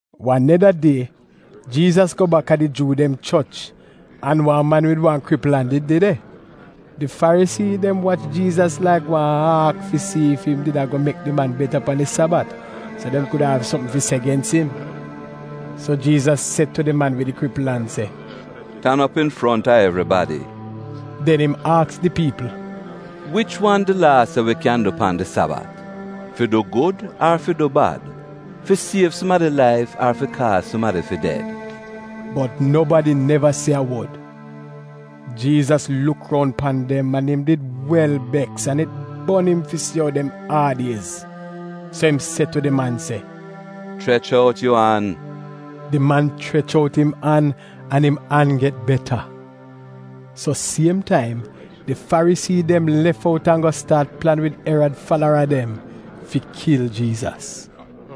Wan neda die Jiizas go bak a di Juu dem choch an wan man wid wan kripl an did de de. Di Farisii dem wach Jiizas laik wan aak fi si ef im did a go mek di man beta pan di Sabat, so dem kuda av sopm fi se gens im. So Jiizas se tu di man wid di kripl an se, “Tan op infronta evribadi.” Den im aks di piipl, “Wich wan di Laa se wi kyan du pan di Sabat: fi du gud ar fi du bad, fi siev sumadi laif ar fi kaaz sumadi fi ded?” Bot nobadi neva se a wod. Jiizas luk roun pan dem an im did wel beks an it bon im fi si ou dem aad-iez. So im se tu di man se, “Chrech out yu an.” Di man chrech out im an, an im an get beta. So siem taim di Farisii dem lef out an go staat plan wid Erad falara dem fi kil Jiizas.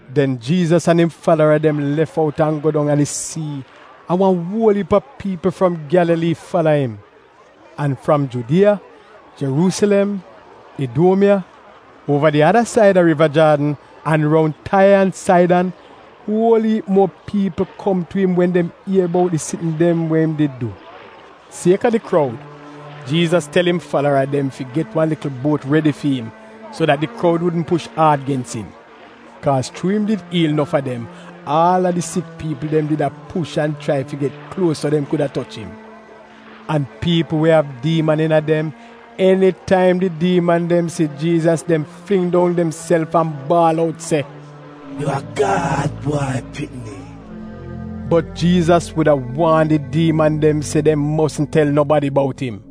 Den Jiizas an im falara dem lef out an go dong a di sii, an wan uol iip a piipl fram Gyalalii fala im. An fram Judiya, Jeruusilem, Iduomiya, uova di ada said a Riva Jaadn, an roun Taiya an Saidan uol iip muo piipl kom tu im wen dem ier bout di sitn dem we im did du. Sieka di kroud, Jiizas tel im falara dem fi get wan likl buot redi fi im, so dat di kroud wudn push aad gens im. Kaaz chuu im did iil nof a dem, aal a di sik piipl dem did a push an a chrai fi get kluos so dem kuda toch im. An piipl we av diiman iina dem, enitaim di diiman dem si Jiizas, dem fling dong demself an baal out se, “Yu a Gad Bwai Pikni!” Bot Jiizas wuda waan di diiman dem se dem mosn tel nobadi bout im.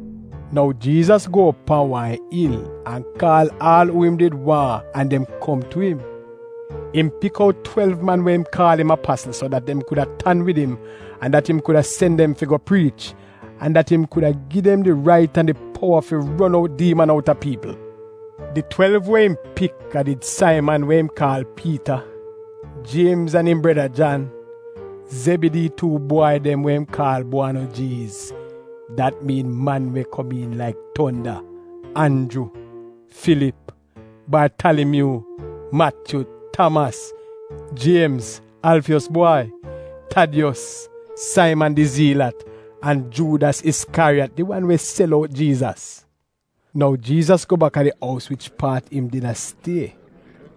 Nou Jiizas go op pan wan il an kaal aal uu im did waahn an dem kom tu im. Im pik out twelv man we im kaal im apasl, so dat dem kuda tan wid im an dat im kuda sen dem fi go priich, an dat im kuda gi dem di rait an di powa fi ron out diiman outa piipl. Di twelv we im pik a did Saiman we im kaal Piita, Jiemz an im breda Jan, Zebidii tuu bwai dem, we im kaal Buowanojiiz (dat miin man we komiin laik tonda); Anju, Filip, Bartalimyuu, Matyu, Tamas, Jiemz Alfiyos bwai, Tadiyos, Saiman di Zelat, an Juudas Iskyariyat, di wan we sel out Jiizas. Nou Jiizas go bak a di ous wich paat im did a stie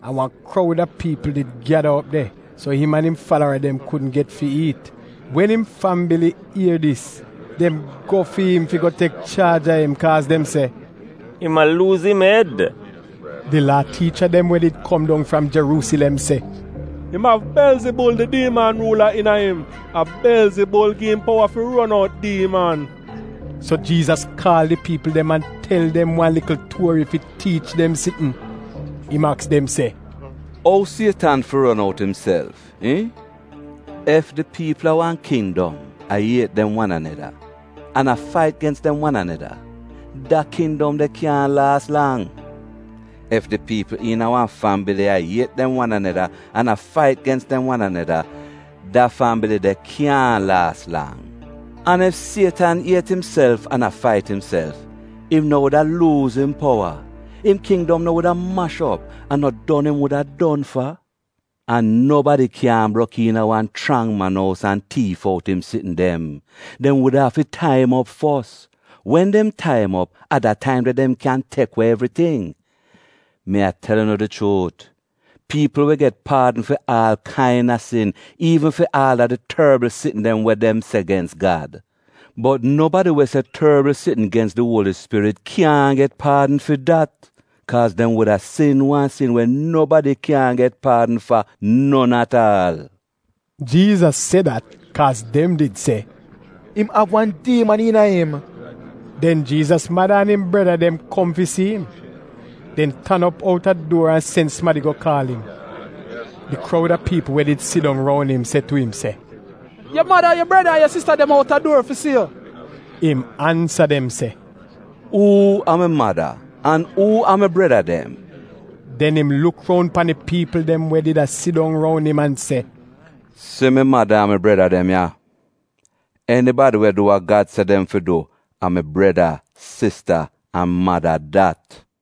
an wan kroud a piipl did gyada op de, so im an im falara dem kudn get fi iit. Wen im fambili ier dis, dem go fi im fi go tek chaaj a im, kaaz dem se, “Im a luuz im ed.” Di Laa tiicha dem we did kom dong fram Jeruusilem se, “Im av Belzibul, di diiman ruula, iina im. A Belzibul gi im powa fi ron out diiman.” So Jiizas kaal di piipl dem an tel dem wan likl tuori fi tiich dem sitn. Im aks dem se, “Ou Sietan fi ron out imself, iihn? Ef di piipl a wan kindom a iet dem wan aneda an a fait gens dem wan aneda, da kindom de kyaahn laas lang. Ef di piipl iina wan fambili a iet dem wan aneda an a fait gens dem wan aneda, da fambili de kyaahn laas lang. An ef Sietan iet imself an a fait imself, im no wuda luuz im powa, im kindom no wuda mash op an no don im wuda don fa? An nobadi kyaahn brok iina wan chrang man ous an tiif out im sitn dem. Dem wuda afi tai im op fos. Wen dem tai im op, a da taim de dem kyan tek we evriting. Mi a tel unu di chuut, piipl wi get paadn fi aal kaina sin, iivn fi aal a di torbl sitn dem we dem se gens Gad. Bot nobadi we se torbl sitn gens di Uoli Spirit kyaahn get paadn fi dat, kaaz dem wuda sin wan sin we nobadi kyaahn get paadn fa non at aal.” Jiizas se dat kaaz dem did se, “Im av wan diiman iina im.” Den Jiizas mada an im breda dem kom fi si im. Dem tan op outa duor an sen sumadi go kaal im. Di kroud a piipl we did a sidong roun im se tu im se, “Yu mada, yu breda, an sista dem outa duor fi si yu.” Im ansa dem se, “Uu a mi mada an uu a mi breda dem?” Den im luk roun pan di piipl dem we did a sidong roun im an se, “Si mi mada an mi breda dem ya! Enibadi we du wa Gad se dem fi du a mi breda, sista, an mada dat.”